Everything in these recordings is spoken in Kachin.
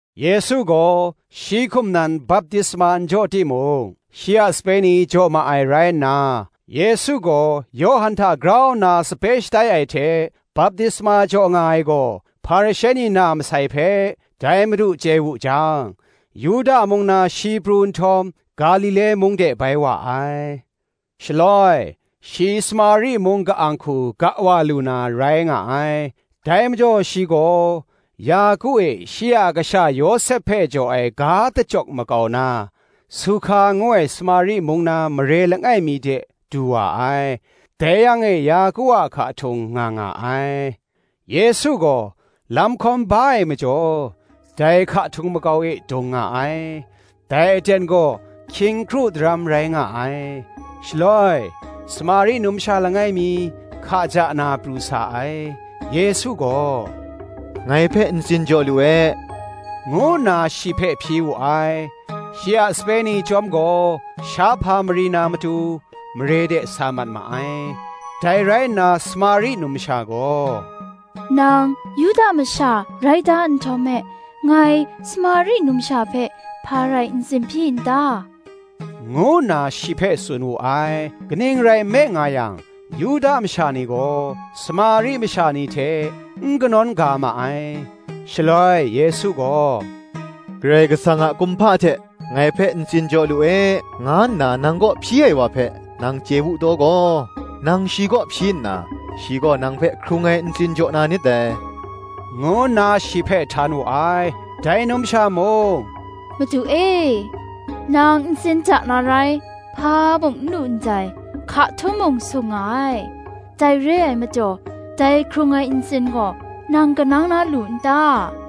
Yesu gaw shi hkum nan baptisma n jaw timung, shi a sape ni jaw ma ai rai nna, Yesu gaw Yawhan hta grau nna sape shatai ai hte baptisma jaw nga ai gaw, Hparishe ni na masai hpe, dai Madu chye wu jang, Yuda mung na shi pru nhtawm, Galile mung de bai wa ai. Shaloi shi Samari mung ka-ang hku ga wa lu na rai nga ai. Dai majaw shi gaw, Yaku e shi a kasha Yawsep hpe jaw ai ga dachyawk makau na, Suhka ngu ai Samari mung na mare langai mi de du wa ai: dai yang e Yaku a hka htung nga nga ai. Yesu gaw lam hkawm ba ai majaw, dai hka htung makau e dung nga ai: dai aten gaw hkying kru daram rai nga ai. Shaloi Samari numsha langai mi hka ja na pru sa ai: Yesu gaw, “Ngai hpe ntsin jaw lu e,” ngu nna shi hpe hpyi wu ai: shi a sape ni chyawm gaw shahpa mari na matu, mare de sa mat ma ai. Dai rai nna Samari numsha gaw, “Nang Yuda masha rai da nhtawm me, ngai Samari numsha hpe, hpa rai ntsin hpyi n ta?” ngu nna shi hpe tsun wu ai: kaning rai nme nga yang, Yuda masha ni gaw Samari masha ni hte n kanawn ga ma ai. Shaloi Yesu gaw, Karai Kasang a kumhpa hte, “Ngai hpe ntsin jaw lu e, nga nna nang kaw hpyi ai wa hpe, nang chye wu taw gaw, nang shi kaw hpyi nna, shi gaw nang hpe hkrung ai ntsin jaw na nit dai,” ngu nna shi hpe htan wu ai. Dai numsha mung, “Madu e, nang ntsin ja na rai hpa mung n lu ndai, hka htung mung sung nga ai; dai re ai majaw dai hkrung ai ntsin gaw, nang kanang na lu n ta?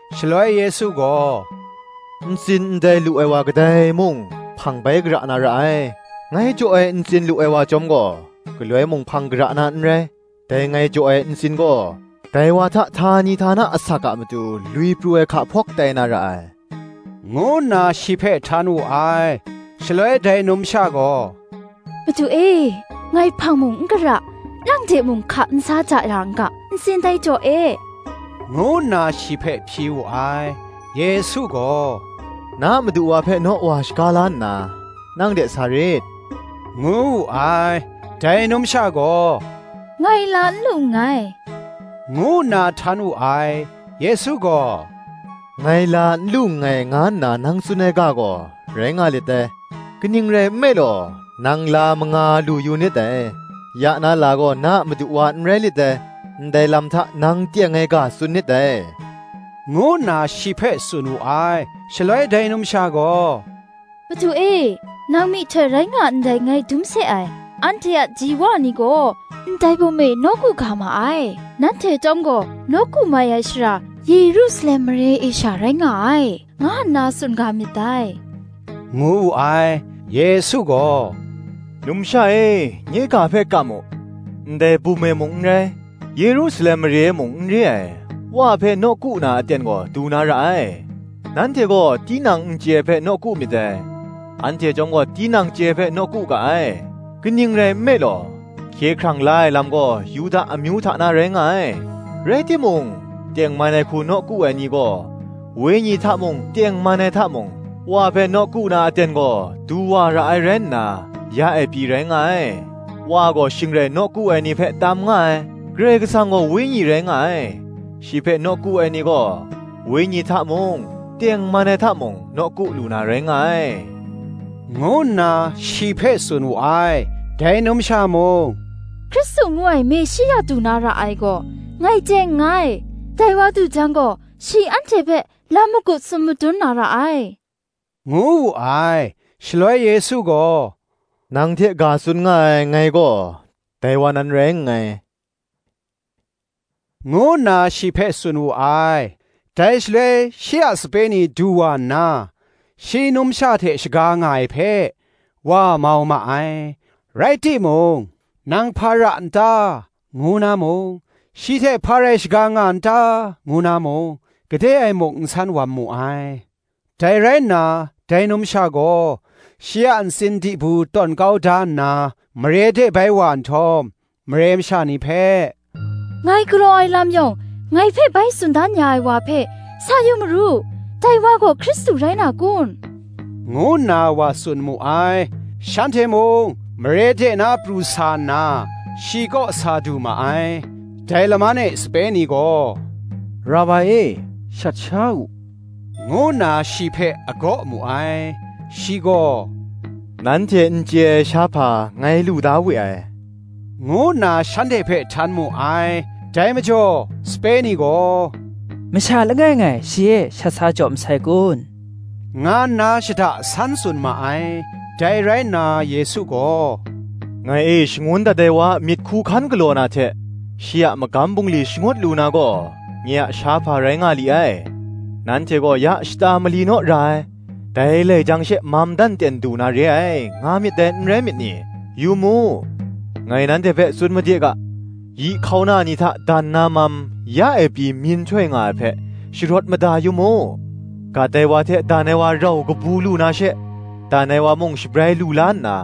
Shaloi Yesu gaw, “Ntsin ndai lu ai wa kadai mung, hpang bai gara na ra ai; ngai jaw ai ntsin lu ai wa chyawm gaw, galoi mung hpang gara na n rai: dai ngai jaw ai ntsin gaw, dai wa hta htani htana asak a matu lwi pru ai hka hpawk tai na ra ai,” ngu nna shi hpe htan wu ai. Shaloi dai numsha gaw, “Madu e, ngai hpang mung n gara, nang de mung hka n sa ja ra n ga, ntsin dai jaw e,” ngu nna shi hpe hpyi wu ai. Yesu gaw, “Na madu wa hpe naw wa shaga la nna, nang de sa rit,” ngu wu ai. Dai numsha gaw, “Ngai la n lu nngai,” ngu nna htan wu ai. Yesu gaw, “Ngai la n lu nngai, nga nna nang tsun ai ga gaw, rai nga lit dai: kaning rai nme law, nang la manga lu yu nit dai; ya na la gaw, na a madu wa n rai lit dai; ndai lam hta nang teng ai ga tsun nit dai,” ngu nna shi hpe tsun wu ai. Shaloi dai numsha gaw, “Madu e, nang myihtoi rai nga ndai ngai dum se ai: anhte a ji wa ni gaw ndai bum e nawku ga ma ai; nanhte chyawm gaw, nawku mai ai shara, Yerusalem mare e sha rai nga ai, nga nna tsun ga myit dai,” ngu wu ai. Yesu gaw, “Numsha e, nye ga hpe kam u: ndai bum e mung n rai, Yerusalem mare e mung n re ai, Wa hpe nawku na aten gaw du na ra ai. Nanhte gaw tinang n chye ai hpe nawku myit dai; anhte chyawm gaw tinang chye ai hpe nawku ga ai: kaning rai nme law, hkye hkrang la ai lam gaw, Yuda amyu hta na rai nga ai. Rai timung, tengman ai hku nawku ai ni gaw, wenyi hta mung, tengman ai hta mung, Wa hpe nawku na aten gaw, du wa ra ai rai nna, ya e pyi rai nga ai: Wa gaw shing rai nawku ai ni hpe tam nga ai. Karai Kasang gaw Wenyi rai nga ai: shi hpe nawku ai ni gaw, wenyi hta mung, tengman ai hta mung, nawku lu na rai nga ai,” ngu nna shi hpe tsun wu ai. Dai numsha mung, “Hkristu ngu ai Meshia du na ra ai gaw, ngai chye nngai; dai wa du jang gaw, shi anhte hpe lam magup tsun madun na ra ai,” ngu wu ai. Shaloi Yesu gaw, “Nang hte ga tsun nga ai, ngai gaw, dai wa nan rai nngai,” ngu nna shi hpe tsun wu ai. Dai shaloi shi a sape ni du wa nna, shi numsha hte shaga nga ai hpe, wa mau ma ai; rai timung, “Nang hpa ra n ta?” ngu na mung, “Shi hte hpa rai shaga nga n ta?” ngu na mung, gade e muk n san wam mu ai. Dai rai nna dai numsha gaw, shi a ntsin dibu tawn kau da nna, mare de bai wa nhtawm, mare masha ni hpe, “Ngai galaw ai lam yawng, ngai hpe bai tsun dan ya ai wa hpe sa yu maru: dai wa gaw Hkristu rai na kun?” ngu nna wa tsun mu ai. Shanhte mung mare de na pru sa nna, shi kaw sa du ma ai. Dai laman e sape ni gaw, “Rabai e, shat sha u,” ngu nna shi hpe agaw mu ai. Shi gaw, “Nanhte n chye ai shahpa ngai lu da we ai,” ngu nna shanhte hpe htan mu ai. Dai majaw, sape ni gaw, “Masha langai ngai shi e shat sa jaw masai kun?” nga nna shada san tsun ma ai. Dai rai nna Yesu gaw, “Ngai e shangun dat ai wa a myit hku hkan galaw na hte, shi a magam bungli shangut lu na gaw, nye a shahpa rai nga li ai. Nanhte gaw, ‘Ya shata mali naw ra ai, dai lai jang she mam dan ten du na re ai, nga myit dai n rai myit ni?’ Yu mu, ngai nanhte hpe tsun made ga, yi hkauna ni hta dan na mam, ya e pyi myin htoi nga ai hpe, sharawt mada yu mu: gat ai wa hte dan ai wa rau kabu lu na she, dan ai wa mung shabrai lu la nna,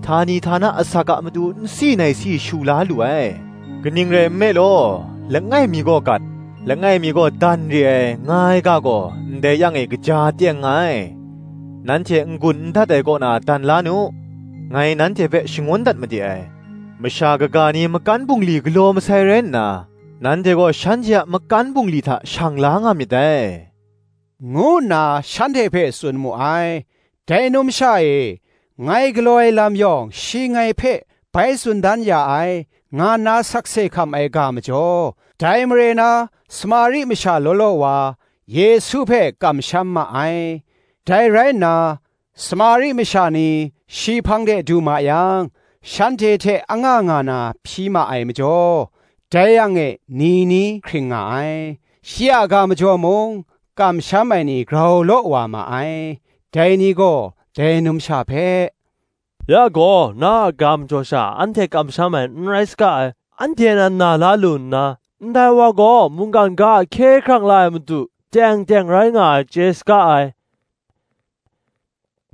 htani htana asak a matu nsi naisi shu la lu ai. Kaning rai nme law, langai mi gaw gat, langai mi gaw dan re ai, nga ai ga gaw, ndai yang e gaja teng nga ai. Nanhte n-gun n dat ai kaw na dan la nu, ngai nanhte hpe shangun dat made ai: masha kaga ni makan bungli galaw masai rai nna, nanhte gaw shanhte a makan bungli hta shang la nga myit dai,” ngu nna shanhte hpe tsun mu ai. Dai numsha e, “Ngai galaw ai lam yawng shi ngai hpe bai tsun dan ya ai,” nga nna sakse hkam ai ga majaw, dai mare na Samari masha law law wa, Yesu hpe kamsham ma ai. Dai rai nna, Samari masha ni shi hpang de du ma yang, shanhte hte anga nga na hpyi ma ai majaw, dai yang e ni ni hkring nga ai. Shi a ga majaw mung kamsham ai ni grau law wa ma ai: dai ni gaw dai numsha hpe, “Ya gaw, na a ga majaw sha anhte kamsham ai n rai saga ai: anhte nan na la lu nna, ndai wa gaw mungkan ga a Hkye hkrang la ai Madu teng teng rai nga ai chye saga ai,”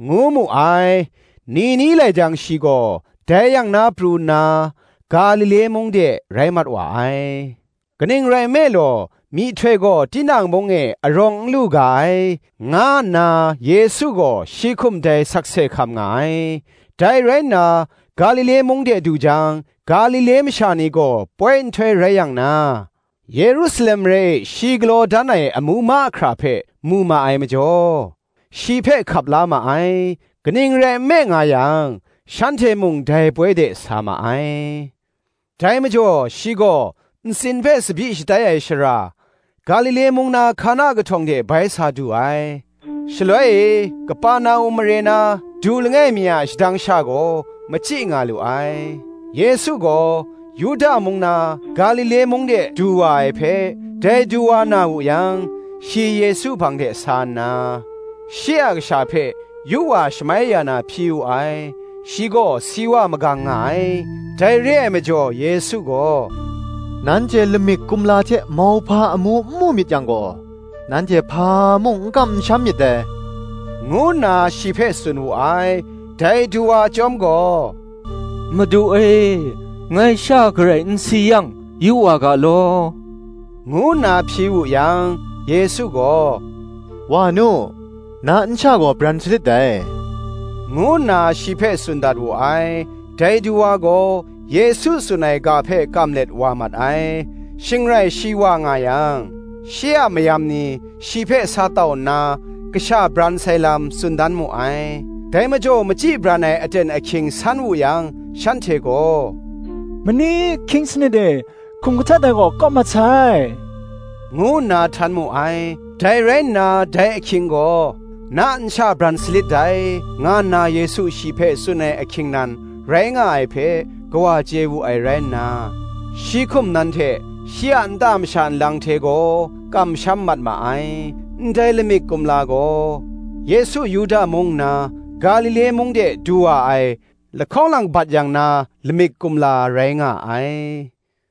ngu mu ai. Ni ni lai jang shi gaw dai yang na pru nna, Galile mung de rai mat wa ai: kaning rai nme law, myihtoi gaw tinang mung e arawng n lu ga ai, nga nna Yesu gaw shi hkum dai sakse hkam nga ai. Dai rai nna, Galile mung de du jang, Galile masha ni gaw poi nhtoi rai yang na, Yerusalem mare e shi galaw dan ai amu mahkra hpe mu ma ai majaw, shi hpe hkap la ma ai: kaning rai nme nga yang, shanhte mung dai poi de sa ma ai. Dai majaw shi gaw, ntsin hpe tsabyi shatai ai shara, Galile mung na Hkana kahtawng de bai sa du ai. Shaloi e Keperna-um mare na du langai mi a shadang sha gaw machyi nga lu ai. Yesu gaw Yuda mung na Galile mung de du wa ai hpe, dai duwa na wu yang, shi Yesu hpang de sa nna, shi a kasha hpe yu wa shamai ya na hpyi wu ai: shi gaw si wa magang nga ai. Dai re ai majaw Yesu gaw, “Nanhte lamik kumla hte mauhpa amu n mu myit yang gaw, nanhte hpa mung n kam n sham myit dai,” ngu nna shi hpe tsun wu ai. Dai duwa chyawm gaw, “Madu e, ngai sha garai n si yang yu wa ga law,” ngu nna hpyi wu yang, Yesu gaw, “Wa nu, na nsha gaw bran salit dai,” ngu nna shi hpe tsun dat wu ai. Dai duwa gaw, Yesu tsun ai ga hpe kam let wa mat ai. Shing rai shi wa nga yang, shi a mayam ni shi hpe sa tau nna, kasha bran sai lam, tsun dan mu ai. Dai majaw machyi bran ai aten ahkying san wu yang, shanhte gaw, “Mani ahkying sanit e hkum kahtet ai gaw kawp mat sai,” ngu nna htan mu ai. Dai rai nna dai ahkying gaw, ‘Na nsha bran salit dai,’ nga nna Yesu shi hpe tsun ai ahkying nan rai nga ai hpe, kawa chye wu ai rai nna, shi hkum nan hte shi a nta masha nlang hte gaw, kamsham mat ma ai. Ndai lamik kumla gaw Yesu Yuda mung nna, Galile mung de du wa ai, lahkawng lang bat yang na lamik kumla rai nga ai.